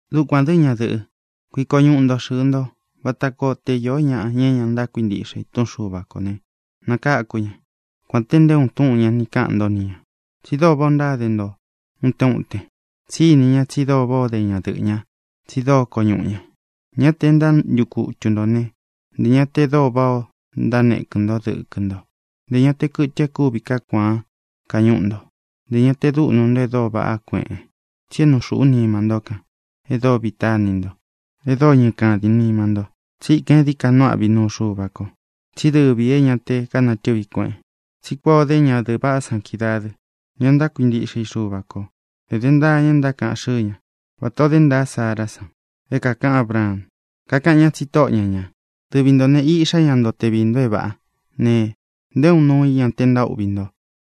Dukuān dɨ́, ñadɨ̄ꞌɨ́, kuiko ñuꞌu ntō xɨɨ nto, vata koo te īó ña é ña ntákuintiꞌxe i túꞌun Xuva kō ne, nakaku ña, kuān te nté uun túꞌūn ña ni kaꞌan ntó ni ñā, tsi dóo váꞌā o ntáde nto utén uten. Tsí ini ña tsi dóo váꞌā ó de ñadɨꞌɨ̄ ñá, tsi dóo koñuꞌu ña. Ña te e ntántukutu ntō né, ntē ña te dóo váꞌā o ntánekɨ̄n nto dɨ́kɨ nto, ntē ña te kɨtɨ e kúvi kaá kuaan kañúꞌu nto, ntē ña te dúꞌnu e dóo vaꞌá kueꞌen. Tsi é nuu xūꞌú nima ntó kān, e dóo vita ini nto, e dóo ñɨkādín nima nto. Tsíkān e dií ka nuu áꞌvi i nuu Xuva ko, tsí dɨvī é ña te kánatɨvi kueꞌen. Tsí kuan ō dé ñadɨ̄ꞌɨ vaꞌá san kídaā dɨ́, ña ntákuintiꞌxe i Xuva kō. Edé ntaa ña e ntákaꞌan xɨ́ɨ ña, vata ō dé ntaa Sárā san é kākaꞌan Ábraan. Kakaꞌan ñá tsi tóꞌo ña ñā. Dɨvi ntō ne, iꞌxá ña nto te viī nto é vāꞌá ne, nté uun nuu i ña te ntaúꞌvi nto.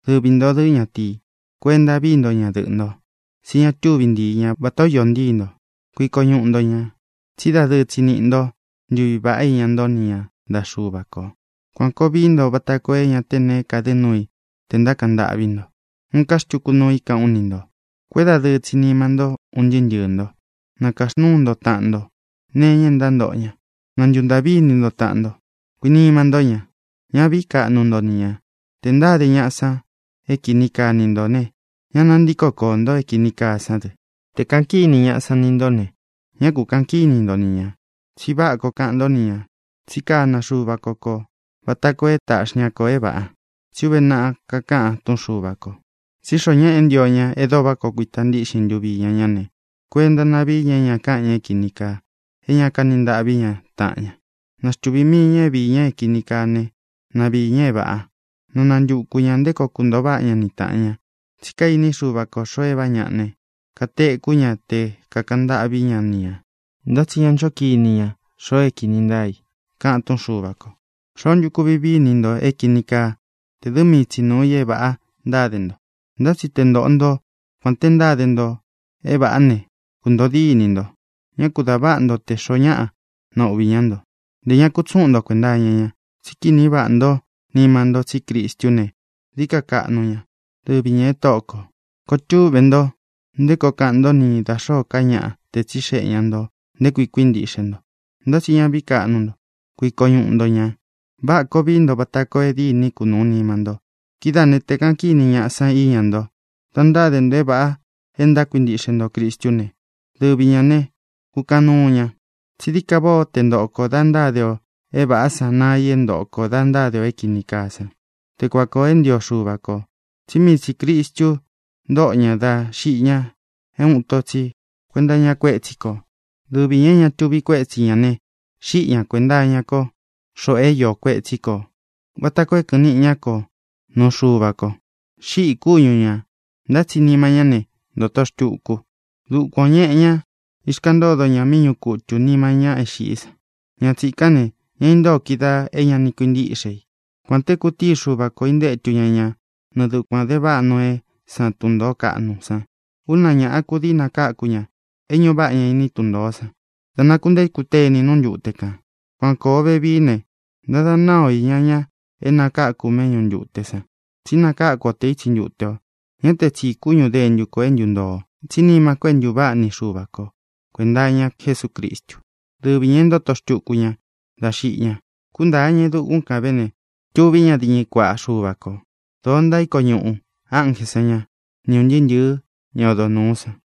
Dɨvi ntō dɨ́, ñatīi, kuenta vií nto ñadɨꞌɨ̄ nto, tsí ña túvi ntíi ña vatā ó iō ntíi nto. Kuiko ñuꞌu nto ñā, tsí dadɨɨ tsi niꞌi nto ntuví vaꞌá iña nto ni ña ntaꞌa Xúva kō. Kuān koo vií nto vata koo é ña te neé kadɨ nuu i tē ntákaꞌan ntâꞌví nto. Uun ká xtuku nuu i káꞌān ú ni ntō. Kuédadɨɨ tsi nima ntó, un ntɨɨ́ ntɨɨ̄ nto. Na kāxnúu nto taꞌan nto nee iña e ntántoꞌo ña. Na ntuntāꞌví ini nto taꞌan nto. Kuinima ntó ña. Ñá vīí kaꞌnu nto ni ñā. Tē ntáde ñaꞌa san é kini kaa ni ntō ne, ña nantíko koō nto é kīni kaa sán dɨ. Tē kaꞌan kíni ñaꞌa san ni ntó ne, ñá ku kāꞌan kíni nto ni ñā, tsi váꞌa koo kaꞌan ntó ni ñā. Tsi kána Xuva ko kō vata koo é taꞌxi ña kō é vāꞌa. Tsí uve naꞌa kakáꞌan túꞌun Xuva kō: Tsí xoo ñáꞌa é ntio ña e dóo váꞌa koo kuita ntíꞌxin ntuvi iña ñá ne, kuenta na víi ña é ña káꞌan ña é kīni kaa, é ña kaní ntaꞌví ña taꞌan ña. Na xtuvī mii ña é viī ña é kīni kaa ne, na viī ña é vāꞌa. Na nantukū ña nté koo kuntoo váꞌa ña ni tāꞌan ña. Tsí kainí Xuva ko xōo é vāꞌá ñaꞌa ne, katekú ña te kākaꞌan ntâꞌví ña ni ñā, ntá tsi ña ncho kini ña xoo é kīni ntáa i, kaꞌan túꞌun Xuva kō. ¿Xoó ntu kuvi vii i ni ntō é kīni kaa te dɨ́ mii tsi nuu ī é vāꞌa ntáde nto? Ntá tsi te ntoꞌo nto kuān te ntáde nto é vāꞌá ne, kuntōo dínī nto. Ñá ku dā váꞌa nto tē xoó ñaꞌa nauꞌvi ñá nto. Ntē ña kutsúꞌun nto kuenta iña ña. Tsí kini váꞌa ntó nima nto tsí Cristú ne, dií ka kaꞌnu ña. Dɨvi ñā e Tóꞌo kō. Koo túꞌve nto nté koo kaꞌan ntó ni da xōó ka ñaꞌa te tsíxeꞌe ña ntō nté kui kuíntiꞌxé nto. Ntá tsi ña vií kaꞌnu nto. Kuiko ñuꞌu nto ñā. Váꞌā koo vií nto vata koo é dîní kunuū nima nto. Kidáā né, tē kaꞌan kíni ñaꞌa san íña nto da ntáde nto é vāꞌa e ntákuintiꞌxe nto Cristú ne, dɨvi ñā ne, kukaꞌan nuu ña. Tsí dií ka váꞌā ó te ntoꞌo kō da ntáde ō é vāꞌá san naa i é ntoꞌo kō da ntáde ō é kīni kaa sán, te kuan kōo é ntio Xuva kō. Tsí mii tsī Cristu ntóꞌo ña dá xiꞌi ña é uun ito tsi kuenta iña kuétsi kō. Dɨvi ñā é ña tuvi kuétsi ñā ne, xíꞌi ña kuēnta iña ko xoꞌo é iō kuetsí kō, vata koo é kɨ̄ꞌɨn niꞌi ña ko nuu Xuva ko. Xíꞌī kúñu ñā, ntá tsi nima ñá ne, ntōto xtuku. Dukuān o ñéꞌe ñā, ixkaꞌan ntódo ña míꞌi ñuꞌu kutū nima ña é xiꞌí san. Ña tsīkán ne, ña intóo kídaā é ña ni kuintíꞌxe i, kuān te kutíi Xuva kō intétu ña ña nɨɨ dukuān de váꞌa Noeé san tun ntōó kaꞌnu san. Úna ñāꞌa kudii nakáku ña é ñuꞌu váꞌa ña iní tun ntōó san dá nakuntéku teni nú ntute kān. Kuan kōo vevií ne, ntántada náa o iña ña é nakaku méꞌñu ntute san, tsí nakáku o te ítsi ntute ō. Ñá tē tsi kúñu dentu kō é ntuntoo, tsí nima ko é ntūváꞌa ni Xuva kō kuenta iña Jesúcristu, dɨ́vi ñā e ntóto xtuku ña dá xiꞌi ña. Kúntāa ña e dukún kan vē ne, tuví ña diñɨ kuaꞌa Xuva kō. Doo ntaíko ñuꞌū ánjē san ñá, ni ūn ntɨɨ́ ntɨ̄ɨ́ ña odo núu san.